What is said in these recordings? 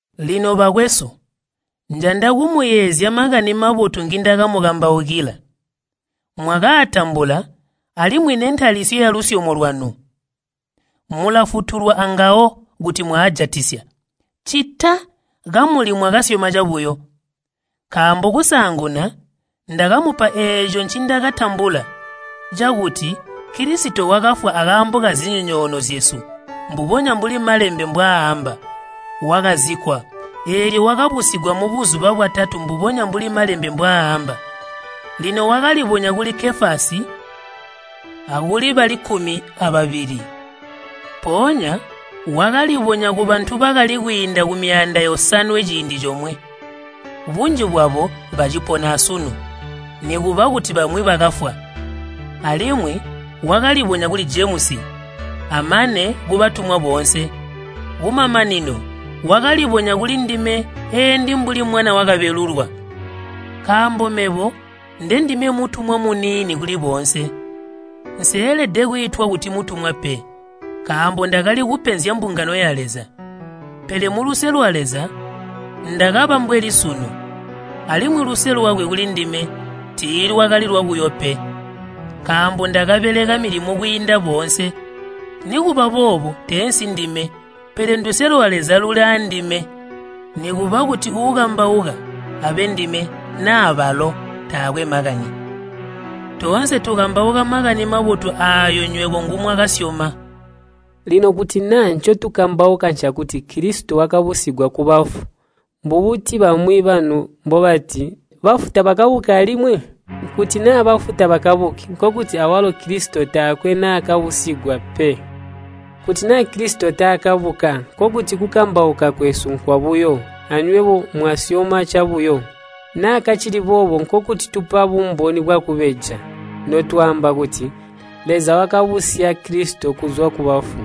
Lino bakwesu, njanda kumuyeezya Makani Mabotu ngindakamukambaukila. Mwakaatambula alimwi nentalisyo yalusyomo lwanu. Mulafutulwa angawo kuti mwaajatisya, ccita kamuli mwakasyoma cabuyo. Nkaambo kusaanguna ndakamupa eeco ncindakatambula, cakuti Kilisito wakafwa akaambo kazinyonyoono zyesu, mbubonya mbuli Malembe mbwaaamba. Wakazikkwa, eelyo wakabusigwa mubuzuba bwatatu mbubonya mbuli Malembe mbwaaamba. Lino wakalibonya kuli Kefasi, akuli bali kkumi ababili. Mpoonya wakalibonya kubantu bakali kwiinda kumyaanda yosanwe ciindi comwe, bunji bwabo bacipona asunu, nikuba kuti bamwi bakafwa. Alimwi wakalibonya kuli Jemusi, amane kubatumwa boonse. Kumamanino wakalibonya kulindime eendi mbuli mwana wakabelulwa. Nkaambo mebo ndendime mutumwa muniini kuli boonse, nseelede kwiitwa kuti mutumwa pe, nkaambo ndakali kupenzya mbungano ya Leza. Pele muluse lwa Leza ndakaba mbweli sunu, alimwi luse lwakwe kulindime tiilwakali lwabuyo pe. Nkaambo ndakabeleka milimo kwiinda boonse, nikuba boobo teensi ndime, pele nduse lwa Leza luli aandime. Nikuba kuti uukambauka abe ndime naa balo, taakwe makani. Toonse tukambauka Makani Mabotu aayo nywebo ngumwakasyoma. Lino kuti naa ncotukambauka ncakuti Kilisito wakabusigwa kubafu, mbubuti bamwi banu mbobati, “Bafu tabakabuki alimwi?” Kuti naa bafu tababuki, nkokuti awalo Kilisito taakwe naakabusigwa pe. Kuti naa Kilisito taakabuka, nkokuti kukambauka kwesu nkwabuyo, anywebo mwasyoma cabuyo. Naa kacili boobo nkokuti tupa bumboni bwakubeja, notwaamba kuti Leza wakabusya Kilisito kuzwa kubafu.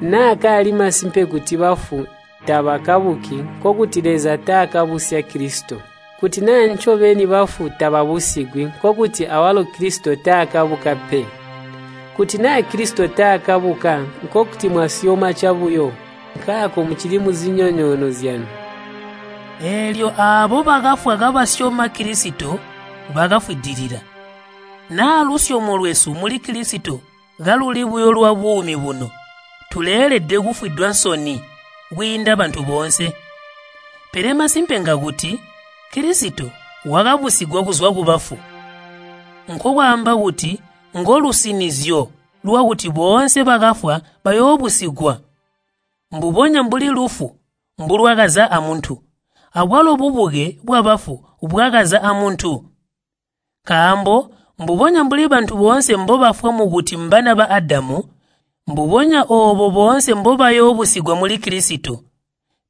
Naa kaali masimpe kuti bafu tabakabuki, nkokuti Leza taakabusya Kilisito. Kuti naa ncobeni bafu tababusigwi, nkokuti awalo Kilisito taakabuka pe. Kuti naa Kilisito taakabuka, nkokuti mwasyoma cabuyo. Nkaako mucili muzinyonyoono zyanu. Eelyo aabo bakafwa kabasyoma Kilisito bakafwidilila. Naa lusyomo lwesu muli Kilisito kaluli buyo lwabuumi buno, tuleelede kufwidwa nsoni kwiinda bantu boonse. Pele masimpe ngakuti Kilisito wakabusigwa kuzwa kubafu. Nkokwaamba kuti ngolusinizyo lwakuti boonse bakafwa bayoobusigwa. Mbubonya mbuli lufu mbulwakaza amuntu, abwalo bubuke bwabafu bwakaza amuntu. Nkaambo mbubonya mbuli bantu boonse mbobafwa mukuti mbana ba Adamu, mbubonya oobo boonse mbobayoobusigwa muli Kilisito.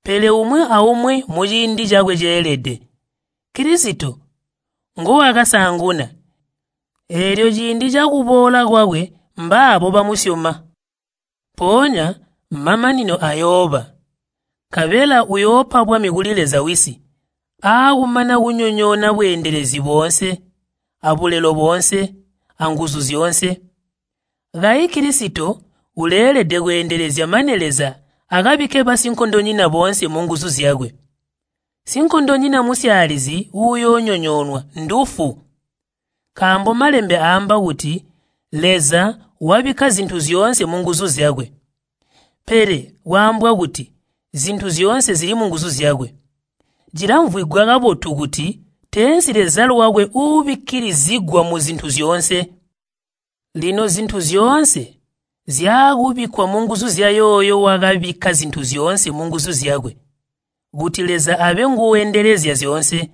Pele umwi aumwi muciindi cakwe ceelede, Kilisito nguwakasaanguna, eelyo ciindi cakuboola kwakwe mbaabo bamusyoma. Mpoonya mamanino ayooba, nkabela uyoopa bwami kuli Leza Wisi aakumana kunyonyoona bweendelezi boonse abulelo boonse, anguzu zyoonse. Kayi Kilisito uleelede kweendelezya mane Leza akabikke basinkondonyina boonse munguzu zyakwe. Sinkondonyina musyaalizi uyoonyonyoonwa ndufu. Nkaambo Malembe aamba kuti, “Leza wabikka zintu zyoonse munguzu zyakwe.” Pele kwaambwa kuti, “Zintu zyoonse zili munguzu zyakwe,” cilamvwigwa kabotu kuti teensi Leza lwakwe uubikkilizigwa muzintu zyoonse. Lino zintu zyoonse zyaakubikkwa munguzu zyayooyo wakabikka zintu zyoonse munguzu zyakwe, kuti Leza abe nguuendelezya zyoonse.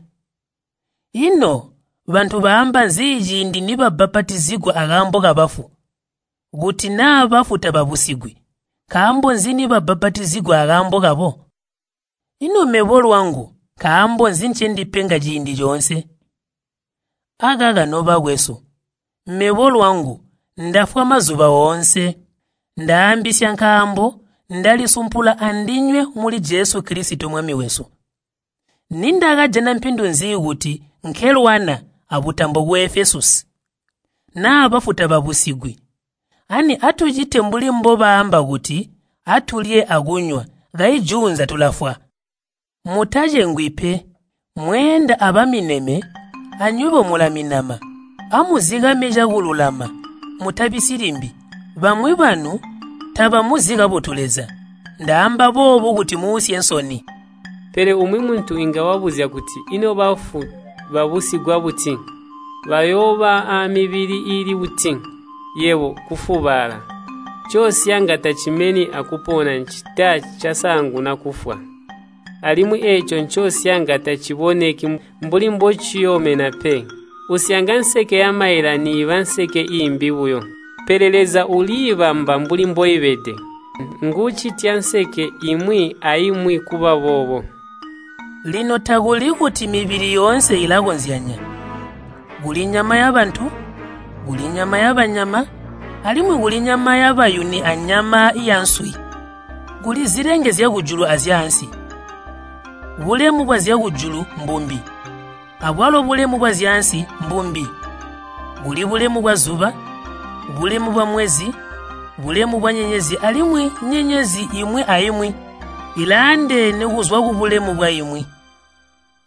Ino, bantu baamba nzi ciindi nibabbapatizigwa akaambo kabafu? Kuti naa bafu tababusigwi, nkaambo nzi nibabbapatizigwa akaambo kabo? Ino mebo lwangu nkaambo nzi ncendipenga ciindi coonse? Akaka nobakwesu, mebo lwangu ndafwa mazuba oonse! Ndaambisya nkaambo ndalisumpula andinywe muli Jesu Kilisito Mwami wesu. Nindakajana mpindu nzi kuti nkelwana abutambo ku Efesusi? Naa bafu tababusigwi, ani atucite mbuli mbobaamba kuti, “Atulye akunywa, kayi juunza tulafwa.” Mutacengwi pe, “Mweenda abamineme, anywebo mulaminama.” Amuzikame cakululama, mutabisyi limbi. Bamwi banu tabamuzi kabotu Leza. Ndaamba boobu kuti muusye nsoni. Pele umwi muntu inga wabuzya kuti, “Ino bafu babusigwa buti? Bayooba aamibili iili buti?” Yebo, kufubaala! Ncosyanga tacimeni akupona ccita casaanguna kufwa. Alimwi eeco ncosyanga taciboneki mbuli mbociyoomena pe, usyanga nseke yamaila niiba nseke iimbi buyo. Pele Leza uliibamba mbuli mboibede. Nguucitya nseke imwi aimwi kuba boobo. Lino takuli kuti mibili yoonse ilakozyanya. Kuli nyama yabantu, kuli nyama yabanyama, alimwi kuli nyama yabayuni anyama yanswi. Kuli zilenge zyakujulu azyaansi. Bulemu bwazyakujulu mbumbi, abwalo bulemu bwazyaansi mbumbi. Kuli bulemu bwazuba, bulemu bwamwezi, bulemu bwanyenyezi alimwi nyenyezi imwi aimwi ilaandeene kuzwa kubulemu bwaimwi.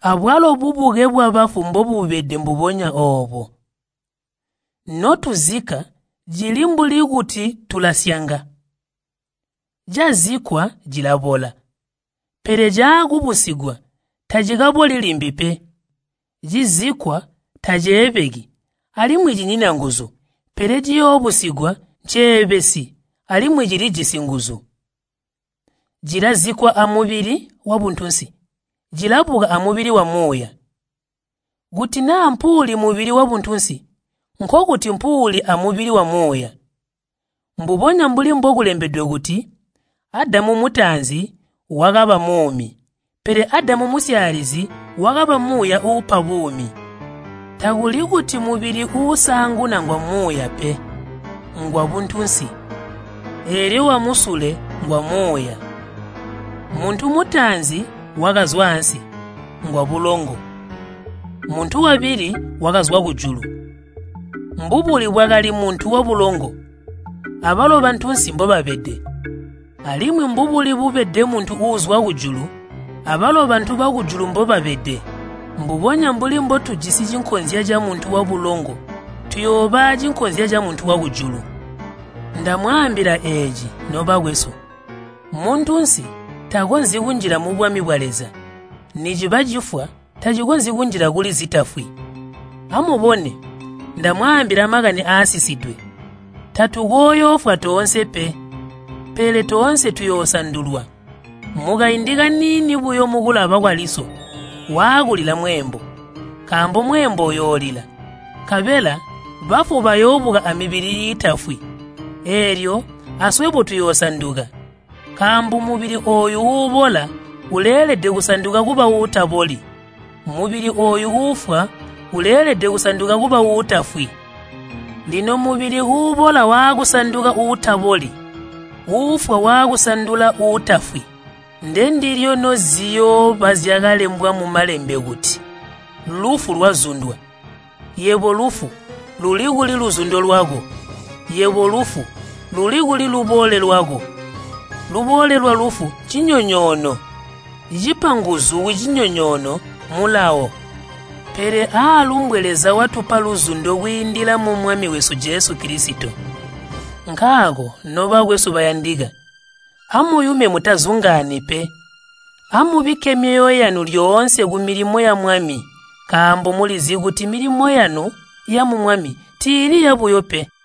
Abwalo bubuke bwabafu mbobubede mbubonya oobo. Notuzikka cili mbuli kuti tulasyanga. Cazikkwa cilabola, pele caakubusigwa tacikaboli limbi pe. Cizikkwa taceebeki alimwi cinyina nguzu, pele ciyoobusigwa nceebesi alimwi cilijisi nguzu. Cilazikkwa amubili wabuntunsi, cilabuka amubili wamuuya. Kuti naa mpuuli mubili wabuntunsi, nkokuti mpuuli amubili wamuuya. Mbubonya mbuli mbokulembedwe kuti, “Adamu mutaanzi wakaba muumi,” pele Adamu musyaalizi wakaba muuya uupa buumi. Takuli kuti mubili uusaanguna ngwamuuya pe, ngwabuntunsi, eelyo wamusule ngwamuuya. Muntu mutaanzi wakazwa ansi, ngwabulongo, muntu wabili wakazwa kujulu. Mbubuli bwakali muntu wabulongo, abalo bantunsi mbobabede. Alimwi mbubuli bubede muntu uuzwa kujulu, abalo bantu bakujulu mbobabede. Mbubonya mbuli mbotujisi cinkonzya camuntu wabulongo tuyooba acinkonzya camuntu wakujulu. Ndamwaambila eeci, nobakwesu, muntunsi takonzyi kunjila mubwami bwa Leza, niciba cifwa tacikonzyi kunjila kuli zitafwi. Amubone! Ndamwaambila makani aasisidwe. Tatukooyoofwa toonse pe, pele toonse tuyoosandulwa, mukaindi kaniini buyo mukulaba kwaliso, waakulila mweembo. Nkaambo mweembo uyoolila, nkabela bafu bayoobuka amibili iitafwi, eelyo aswebo tuyoosanduka. Nkaambo mubili ooyu uubola uleelede kusanduka kuba uutaboli, mubili ooyu uufwa uleelede kusanduka kuba uutafwi. Lino mubili uubola waakusanduka uutaboli, uufwa wakusandula uutafwi, ndendilyo noziyooba zyakalembwa mu Malembe kuti, “Lufu lwazundwa.” “Yebo lufu, luli kuli luzundo lwako? Yebo lufu, luli kuli lubole lwako?” Lubole lwalufu ncinyonyoono, cipa nguzu kucinyonyoono Mulawo. Pele aalumbwe Leza watupa luzundo kwiindila mu Mwami wesu Jesu Kilisito. Nkaako, nobakwesu bayandika, amuyume mutazungaani pe, amubikke myoyo yanu lyoonse kumilimo ya Mwami nkaambo mulizi kuti milimo yanu yamu Mwami tiili yabuyo pe.